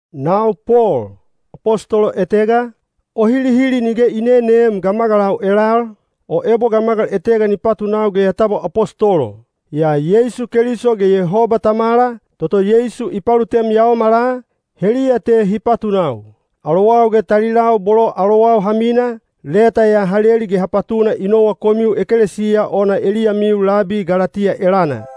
Nau Pol, apostolo etega, o hilihili nige i neneem gamagalau elal, o ebo gamagal etega ni patunau ge ya tabwa apostolo. Yaa Yeisu Keliso ge Yehoba Tamala, toto Yeisu i palutem yaomala, heliya te hi patunau. Alowau ge talilau bolo alowau ha mina, leta ya ha leli ge ha patuna i nowa komiu ekelesiya ona eliyamiu labi Galatiya elana.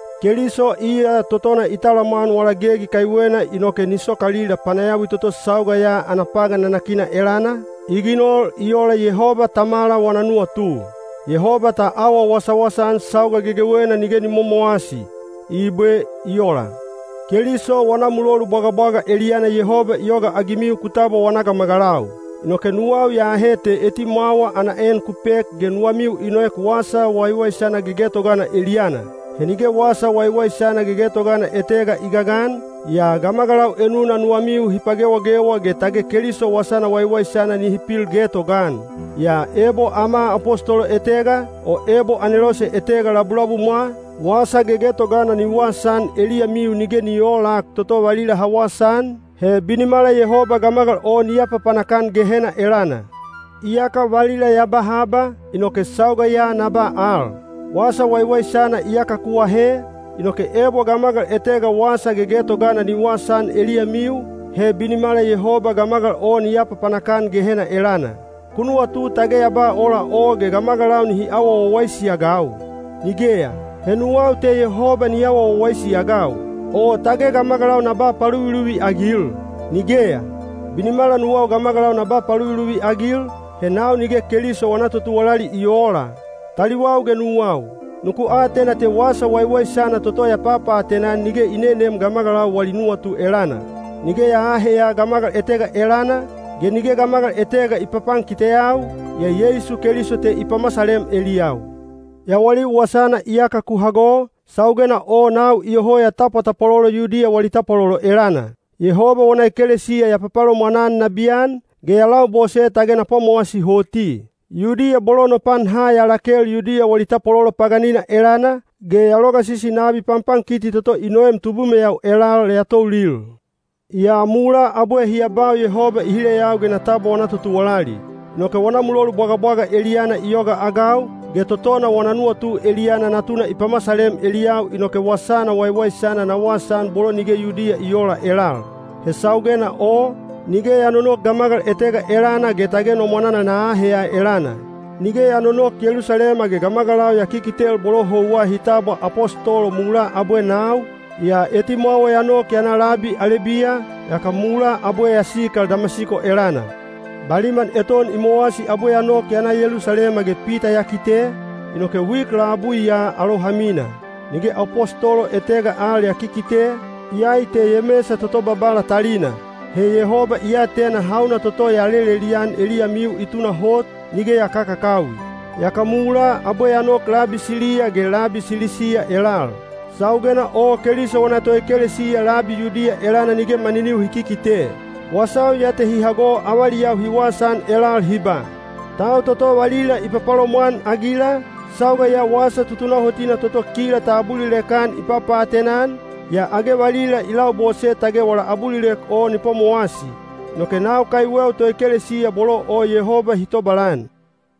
Keliso iya totona i talamwan wala gegi kaiwena inoke ni sokalila panayawi toto sauga ya ana pagan nanakina elana, i ginol i ola Yehoba Tamala wana nuwatu. Yehoba ta awa wasawasa-an sauga gegewena nige ni momowasi. Ibwe. I ola. Keliso wana mulolu bwagabwaga eliyana Yehoba i yogaagimiu ku tabwa wana gamagalau. Inoke nuwau ya ahe te etimwawa ana en ku pek ge nuwamiu i noek wasa waiwaisana gegetogana eliyana. He nige wasa waiwaisana gegetogana etega i gagan, yaa gamagalau enuna nuwamiu hi pagewagewa ge tage Keliso wasana waiwaisana nihi pil getogaan. Yaa ebo ama apostolo etega, o ebo anelose etega labulabumwa, wasa gegetogana ni wasaan eliyamiu nige ni oolak toto valila ha wasaan, he binimala Yehoba gamagal o ni apapanak-an Gehena elana. Iyaka valila ya ba haba, inoke sauga ya na ba al: wasa waiwaisana iyaka ku ahe, inoke ebo gamagal etega wasa gegetogana ni wasaan eliyamiu, he binimala Yehoba gamagal o ni apapanak-an Gehena elana. Ku nuwatu tage ya ba ola o ge gamagalau nihi awa wawaisi-agau? Nigeya, he nuwau te Yehoba ni awa wawaisi-agau. O tage gamagalau na ba paluviluvi-agil? Nigeya! Binimala nuwau gamagalau na ba paluviluvi-agil, he nau nige Keliso wana totuwalali i oola. Taliwau ge nuwau, nuku atena te wasa waiwaisana toto ya papaatena-an nige i nenem gamagalau wali nuwatu elana. Nige ya aaheya gamagal etega elana, ge nige gamagal etega i papankiteyau, yaa Yeisu Keliso te i pamasalem eliyau. Yawaliu wasana iyaka ku hago, saugena o nau iyoho ya tapwatapwalolo Yudiya wali tapwalolo elana. Yehoba wana ekelesiya ya papalomwan-an nabiyan, ge ya labose tage na pwamowasi hoti. Yudiya bolo no pan ha ya lakel Yudiya wali tapwalolo paganina elana, ge ya logasisi nabi panpankiti toto i noem tubumeyau elal ya toulil. Yaa mulaa abwe hi abau Yehoba i hileyau ge na tabwa wana totuwalali. Inoke wana mulolu bwagabwaga eliyana i yogaagau, ge totona wana nuwatu eliyana Natuna i pamasalem eliyau inoke wasana waiwaisana na wasaan bolo nige Yudiya i oola elal. He saugena o, nige ya nonok gamagal etega elana ge tage no mwananal na aheya elana. Nige ya nonok Yelusalema ge gamagalau ya kikitel bolo houwa hi tabwa apostolo mulaa abwe nau, yaa etimwawa ya nok ya na labi Alebiya, yaka mulaa abwe ya sikal Damasiko elana. Baliman eton i mowasi abwe ya nok ya na Yelusalema ge Pita ya kite, inoke wik labui ya alou ha mina. Nige apostolo etega al ya kikite, iyai te Yemesa toto Babala talina. (He Yehoba i atena hauna toto ya lelelian eliyamiu i tunahot, nige ya kakakawi.) Yaka mulaa abwe ya nok labi Siliya ge labi Silisiya elal. Saugena o Keliso wana toekelesiya labi Yudiya elana nige maniniu hi kikite. Wasau ya te hi hago avaliyau hi wasaan elal hi ba, “Tau toto valila i papalomwan-agila, sauga ya wasa tutunahotina toto kila ta abulilek-an i papaatena-an, yaa age valila i labose tage wala abulilek o ni pwamowasi.” Inoke nau kaiweu toekelesiya bolo o Yehoba hi tobalan.